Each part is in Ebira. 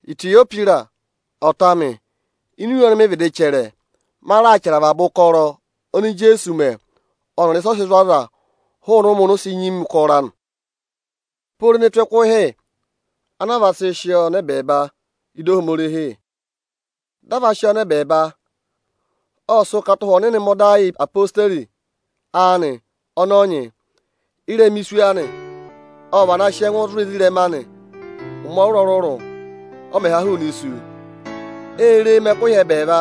Itiyohwịrọsị, ọta amị, ini iwe ọnị mị vịdị chẹrẹ, ma raà chẹrẹ avaba ụkọrọ oni Ijeesu mẹ ọnịrị ịsị ọ sị zụ̀ aza hụụnị ụmẹ oni o si nyima ụkọrọ anị pooro ne tù ẹkụhị ana a va sị sị ọọ nọ ẹbẹẹba ịdị Ohomorihi. Dị a va sị ọọ nọ ẹbẹẹba, ộ sị ụkata Ụhwẹ Ọnịnị mẹ ọda yị odeyi anị ọnị ọ nyị. Ị́rẹma isu anị, ộ vana sị ẹngụ zụ̀ ezirẹma anị ụmẹ ọrụrụ-ọrụrụ, ọ mẹ̀ ha hụụnị isu. Ê re e mẹ ẹkụhị ẹbẹẹva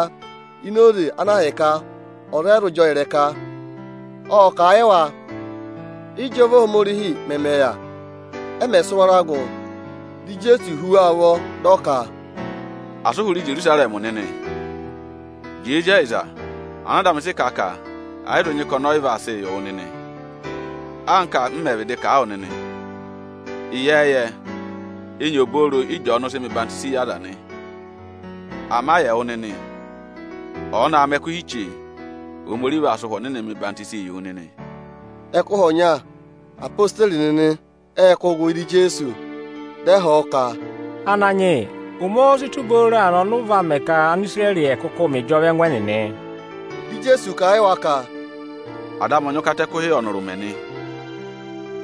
ini oze ana ahịka ọza ọ yị zụ jị ọọ ịrẹka ka ọ yàra. Ộ kà a yị wa ịjọva Ohomorihi mẹmẹ yà. Ẹ mẹ̀ sị wara gụ, dị Ijeesu hú wa ụvọ, dị ọ ka, “Asị ụ hụrẹ Ijerusarẹmị nịnị! Ama jẹẹ zí ẹyịza ana Ada amị wo oto anị ka ọnị vaa sịị yị wụ nịnị anka m mẹ̀ vịdị kà a wụ nịnị. Ịyẹẹyẹ, enyi obooro Ị́jọọnụụ̄ sịị mẹ ọyịhwenyii yị aza nị. Ama yị ẹwụ nịnị, ọ̀ọ na aa mẹ ẹkụhị chee, Ohomorihi vaa sị Ụhwẹ Ọnịnị hụụ wụ nịnị enyi.” Ẹkụhị ọnya, odeyi nịnị ệ kụ́ gụ ị́dị Ijeesu, dị ẹ họ̀ ọ ka, “Ananyị yị, ụmẹ óó si tù booro aanị ọnị ụ vaa mẹ ka Anisirẹrị nịnị ẹ̀ kụkụụ mẹ ịjọva ẹngụ ẹnịnị?” Dị Ijeesu kà a yị wa ka, “Ada amị ọ nyị ụkata ẹkụhị ọnịrị ụmẹ nị,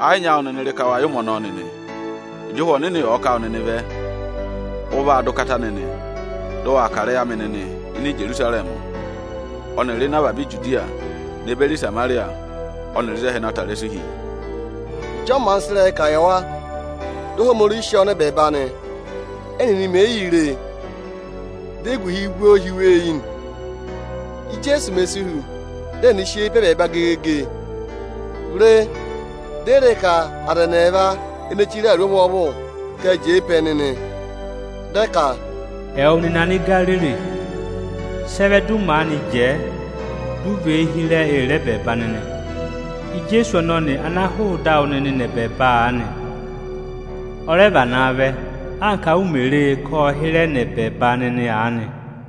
ẹ yị nyị áawụ nịnị rị ka wa yẹ ụmẹ ọnọọ nịnị. Ịjị Ụhwẹ Ọnịnị ọ̀ọ ká wụ nịnị vẹ, ụ vaa dọ ụkata nịnị, dị ụ waa kà ịrẹyị amị nịnị Íjerusarẹmị ọnịrị ịnị avaba Ijudiya ne beri Ịsamarịya ọnịrị ịzị ẹhẹ na ta ịrẹsụ hi.” Ịjị ọ maanị sị ịrẹyị kà yị wa, dị Ohomorihi sị ọọ nọ ẹbẹẹba nị. Ẹ́nịnị mèe yii re e, di eguhi vú ọọ hi wa eyi nị. Íjeesu mè si hu, dị ẹnịnị sị eyi pe ẹbẹẹba gegege ee re, di e re ka aza ẹnị ẹẹva ene chire awuru ọvwọọvụ ka ệ jẹẹ pe ẹnị nị. Dị ẹ ka, “Ẹwụ nịnị Anigariri, sị ẹ vẹ dị ụ maanị jẹẹ, dị ụ và eyi hịrẹ ee re ẹbẹẹba nịnị? Ijeesu ọnọnị ana hụụ ịdị awụ nịnị nọ ẹbẹẹba aanị, ọ rẹ vanaa vẹ, anka u mè re e ka ộ hịrẹ nọ ẹbẹẹba nịnị aanị.”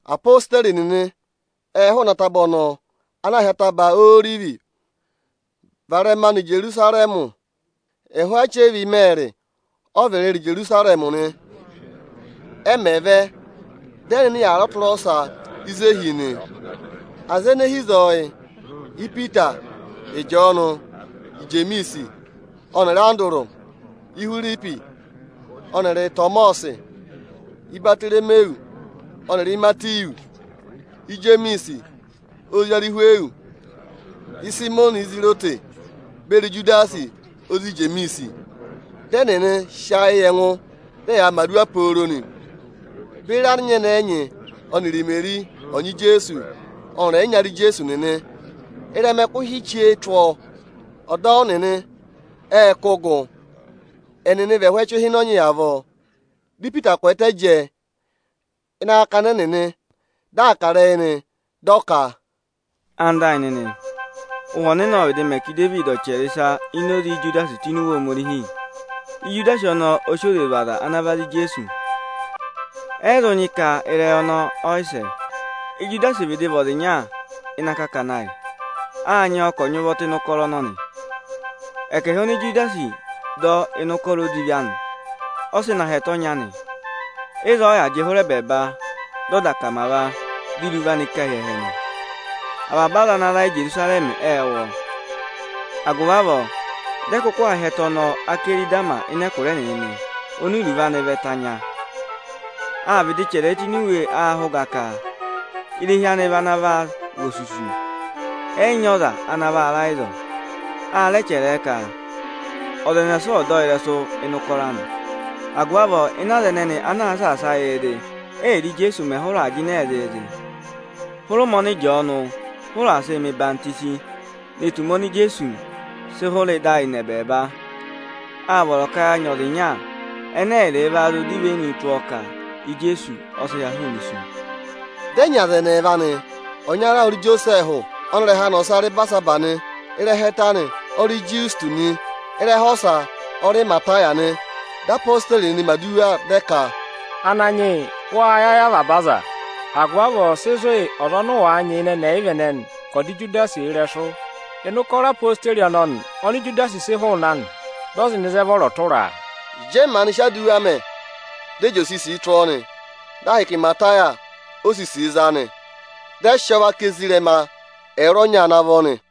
Apositeri nịnị ệ hụụnị ataba ọnọọ ana aā hị́ Ataba Orivi varẹma nọ Ijerusarẹmị. Ẹhụụ achẹva ịmẹẹrị ọ vị rịrị Ijerusarẹmị nị. Ẹ mẹ̀ vẹ, dị ẹ nọ ịnị aku ịnị ọtụrọsa ịzị ẹnịnị hi nị. Aza ene hi ịzọọ yị: Ipita, Ịjọọnụ, Ijemiisi ọnịrị Andụrụ, Ihwiripi ọnịrị Ịtọmọsị, Ibatoromiwu ọnịrị Imatiwu, Ijemiisi ozi Arịhwịyọsị, Ịsayịmọnị ana aā hị́ Izirọtị (Anakwẹngụhi) beri Ijudasi ozi Ijemiisi. Dị ẹnịnị sị ayị yị ẹngụ, dị ẹyaa mẹ̀ aduwa pooro nị, beri anyẹnẹẹ ẹnyị ọnịrị Imeri ọnyị Ijeesu ọnịrị ẹyịnyara Ijeesu nịnị. Ịrẹma ẹkụhị chee tụ́ ọọ, ọdọwụ nịnị ệ kụ́ gụ. Ẹnịnị vị ẹhụụ ẹchịhịnọnyị avọọ. Dị Ipita kwẹẹtẹ jẹẹ ịnị akakana ẹnịnị, dị aa kà ịrẹyị nị, di o ka: “Ẹwụ nịnị ẹyịnyara amị, Ụhwẹ Ọnịnị ộ vịdị mẹ ka Idevidi ọ̀ chẹrẹ ịsa ini oze Ijudasi tụ́ ini Iwe Ohomorihi. Ijudasi ọnọọ ọ sị oze zụ̀ aza ana va za Ijeesu nị. Ẹ yị zụ nyị ka ịrẹyị ọnọọ ẹyị sẹ. Ijudasi vịdị vị ọza ịnya ịnị akakana ayị, â nyị ọọ ka ọ̀ nyị ụvọ tụ́ ịnị ụkọrọ ọnọnị. Ẹkẹhị oni Ijudasi dọ ịnị ụkọrọ odivi anị, ọ sị na hị́ ẹtẹ ọnya nị. Ịzọọ ọ yà jị hụrẹ ẹbẹẹba, dị ọ dà akamava, di irivu anị ká hi ẹhẹ nị. Avaba aza ana ra Íjerusarẹmị ệ wụ́ ọọ. Agụvị avọọ, dị ẹ kụkụ aa hị́ ẹtẹ ọnọọ ‘Akẹrịdama’ ịnị ẹkụra ẹnịnị nị, oni iruvo anị vị ‘Ẹtẹ anya’. Â vịdị chẹrẹ ẹ tụ́ ini iwe ahẹ ụga ka: ‘Irehi anị vị ana vaa vị osusu, ẹ yị nyị ọza ana vaa ra ịzọọ.’ A rẹ chẹrẹ ẹ ka: ‘Ọza ẹnẹsa ọ̀ dọ ọ ịrẹsụ ịnị ụkọrọ anị.’ Agụvị avọọ ịnị aza ẹnẹnị ana aa saasa yịị zị, ẹ́yịrị Ijeesu mẹ̀ hụrẹ aa jịnẹẹ zịịzị hụrẹ ụmẹ ọnị Ịjọọnụ hụrẹ aa sịị mẹ̀ ọyịhwọzenyi ne tù ụmẹ oni Ijeesu sị hụrẹ ịdị ayị nọ ẹbẹẹba, â vọrọ ka à nyị ọza ịnya ẹnẹ ẹyịrịị va zụụ dọ ivenu tụ́ ọọ ka Ijeesu ọ sị ha hụụnị isu.” Dị ẹ nyị aza ẹnị ẹẹva nị. Ọnyara ọ rị Ijosẹẹhụ ọnị ịrẹha anị ọsa rị Ibarisabasi nị, ịrẹha ẹtẹ anị ọ rị Ịjọsịtọsị nị. Ịrẹha ọsa ọ rị Imataya nị. Dị odeyi nịnị mẹ̀ aduwa dị ẹ ka, “Ananyị yị, wâ yẹ ayị avaba aza. Agụvị avọọ sị zụ̀ yị ọza ọnị ụ wàa nyị ịnị ẹnị ẹyịva ẹnẹnị ka ọ̀ dọ Ijudasi ịrẹsụ ịnị ụkọrọ odeyi ọnọnị oni Ijudasi sị hụụnị anị, dị ọ zị nọ ịzị ẹ vọrọ tụra a.” Ịjị ẹ maanị sị aduwa mẹ̀, di e sì ọza ọnị ọ vọrọ tụra nị. Dị ahịka Imataya ọ za nị, dị ẹ sị ọọ vaka ezirẹma ẹwụrọnya ana vọ nị.